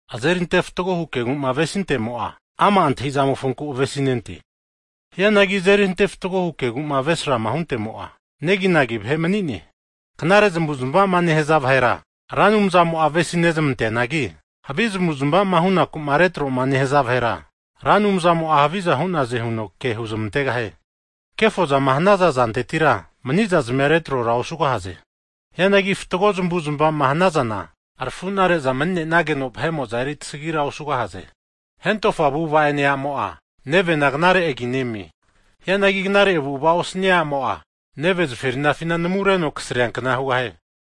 Azerinte fatgohu kegu'ma avesintemo'a, ama' antahi'zamofonku avesinente. Hianagi azeri ante fatgohu kegu'ma avesrama hunte'mo'a, neginagi vahe mani'ne. Knare zamavu'zamava'ma nehaza vahera, Ra Anumzamo'a avesi nezamanteanagi, havi zamavu'zmava'ma hunaku'ma retroma nehaza vahera, Ra Anumzamo'a haviza hu'naze huno huzmantegahie. Kefozama hanaza zantetira mani'zazmia retrora osugahaze. Hianagi fatgo zamavu'zmavaza'ma hanazana, rafunare'za mani'nageno, vahe'mo'za eri tasagira osugahaze. Hentofa avu'ava'ene a'mo'a, nevena knare agi nemie. Hianagi knare avu'ava osania a'mo'a, nevena zaferinafi namureno kasriankna hugahie.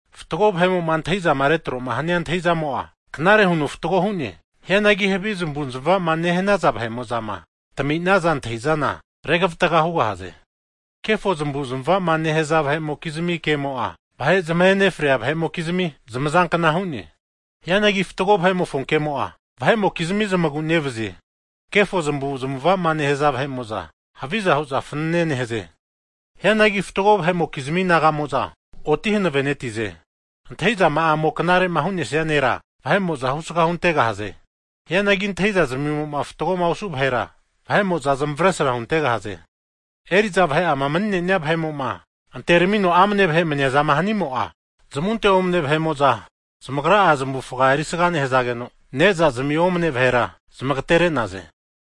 Fatgo vahe'mo'ma antahi'zama retroma hania antahi'zamo'a, knare huno fatgo hu'ne. Hianagi havi zamavu'zamava nehanaza vahe'mo'zama, tami'naza antahi'zana, regavatga hugahaze. Kefo zamavu'zamava'ma nehaza vahe'mokizmi ke'mo'a, vahe zamahe nefria vahe'mokizmi zamazankna hu'ne. Hianagi fatgo vahe'mofo kemo'a, vahe'mokizmia zamagu'nevazie. Kefo zamavu zamava'ma nehaza vahe'mo'za, haviza hu'za fanane nehaze. Hianagi fatgo vahe'mokizmi naga'mo'za, oti hanavenetize. Antahi'zama'amo'ma knare'ma hu'nesia nera, vahe'mo'za husga huntegahaze. Hianagi antahi'za zmimo'ma fatgoma osu vahera, vahe'mo'za zamavesra huzmantegahaze. Eri'za vahe'ama mani'ne'nia vahe'mo'ma, anteramino amane vahe maniazama hanimo'a, zamunte omane vahe'mo'za zamagra'a zamavufaga erisga nehazageno ne'zazmia omane vahera zamagatere'naze.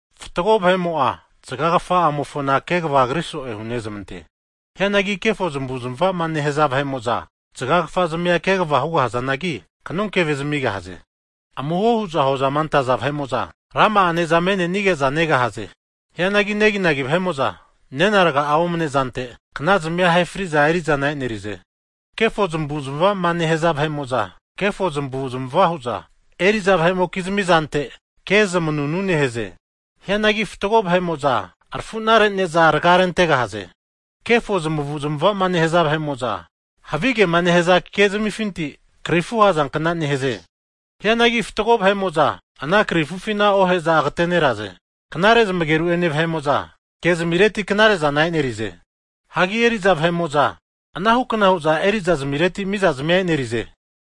Fatgo vahe'mo'a zagagafa'amofona kegavagriso'e hunezamante. Hianagi kefo zamavu'zamava'ma nehaza vahe'mo'za zagagafa zamia kegava hugahazanagi, kanonkeve zamigahaze. Amuho hu'za hozama antaza vahe'mo'za, rama'a ne'za me'nenige'za negahaze. Hianagi neginagi vahe'mo'za, nena raga'a omne'zante knazmia ahe fri'za eri'zana e'nerize. Kefo zamavu'zamava'ma nehaza vahe'mo'za kefo zamavu'zamava hu'za eri'za vahe'mokizmi zante ke zmanunu nehaze. Hianagi fatgo vahe'mo'za, arafuna rene'za raga rentegahaze. Kefo zamavu'zamava'ma nehaza vahe'mo'za, havigema nehaza kezamifinti, krifu ahazankna nehaze. Hianagi fatgo vahe'mo'za ana krifufina ohe'za agateneraze. Knare zamageru'ene vahe'mo'za, kezmireti knare'zana e'nerize. Hagi eri'za vahe'mo'za, anahu kna hu'za erizazmireti mizazmia e'nerize.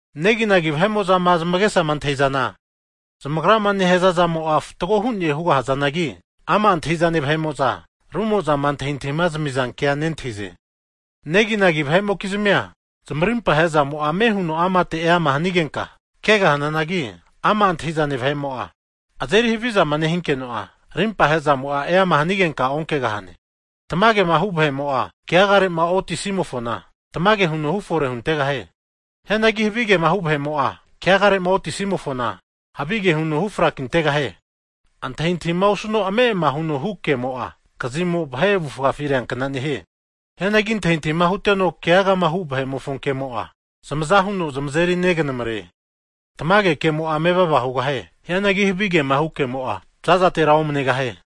Neginagi vahe'mo'zama zamagesama antahi'zana, zamagrama nehaza zamo'a fatgo hu'ne hugahazanagi, ama' antahi'zane vahe'mo'za rumo'zama antahintahima zamizankea nentahize. Neginagi vahe'mokizmia zamarimpa he'zamo'a ame huno amate eama hanigenka kegahananagi, ama' antahi'zane vahe'mo'a azeri havizama nehinkeno'a, rimpa he'zamo'a eama hanigenka onkegahane. Tamagema hu vahe'mo'a, keagare'ma otisimofona tamage huno hufore huntegahie. Hianagi havigema hu vahe'mo'a, keagare'ma otisimofona havige huno hu frakintegahie. Antahintahima osuno ame'ama huno hu ke'mo'a, kazimo vahe avufafi reankna nehie. Hianagi antahintahima huteno, keagagama hu vahe'mofo kemo'a, zamaza huno zamazeri neganamare. Tamage ke'mo'a mevava hugahie. Hianagi havigema hu kemo'a, za'zatera omanegahie.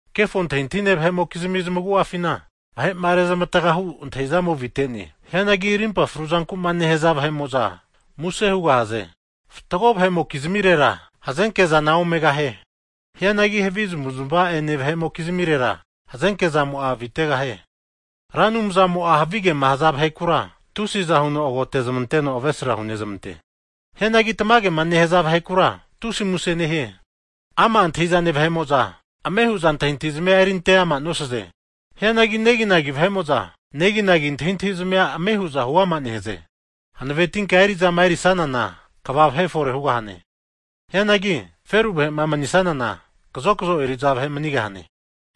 Kefo antahintahine vahe'mokizmi zamagu'afina vahe'ma rezmavataga hu antahi'zamo avite'ne. Hianagi rimpa fru zanku'ma nehaza vahe'mo'za muse hugahaze. Fatgo vahe'mokizmirera hazenke zana omegahie. Hianagi havi zamavu'zamava'ene vahe'mokizmirera, hazenke zamo'a avitegahie. Ra Anumzamo'a havigema nehaza vahekura, tusiza huno agotezmanteno avesra hunezamante. Hianagi, tamagema nehaza vahekura, tusi muse nehie. Ama' antahi'zane vahe'mo'za ame hu'za antahintahi zazmia eri ante ama nosaze. Hianagi neginagi vahe'mo'za neginagi antahintahizamia ame hu'za huama nehaze. Hanavetinka eri'zama erisanana, kva vahe fore hugahane. Hianagi feru vahe'ma manisanana, kazokzo eri'za vahe manigahane.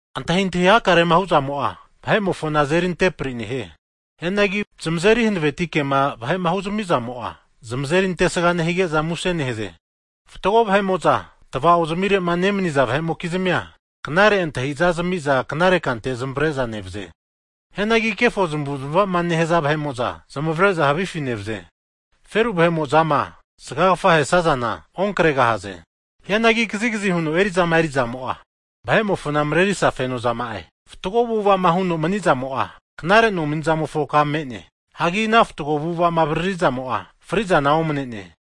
Antahintahi hakarema hu'zamo'a, vahe'mofona azeri antepri nehie. Hianagi zamazeri hanaveti ke'ma vahe'ma huzami zamo'a, zamazeri antesga nehige'za muse nehaze. Fatgo vahe'mo'za tava'ozamire'ma nemaniza vahe'mokizmia, knare antahi'za zami'za knare kante zamavare'za nevaze. Hianagi kefo zamavu'zamava'ma nehaza vahe'mo'za zamavare'za havifi nevaze. Feru vahe'mo'zama zagagafama ahesazana onkregahaze. Hianagi kazigazi huno eri'zama eri'zamo'a, vahe'mofona marerisa feno zama'e. Fatgo avu'ava'ma huno mani'zamo'a, knare nomanizamofo ka me'ne. Hagi ana fatgo avu'ava'ma avaririzamo'a, fri'zana omane'ne.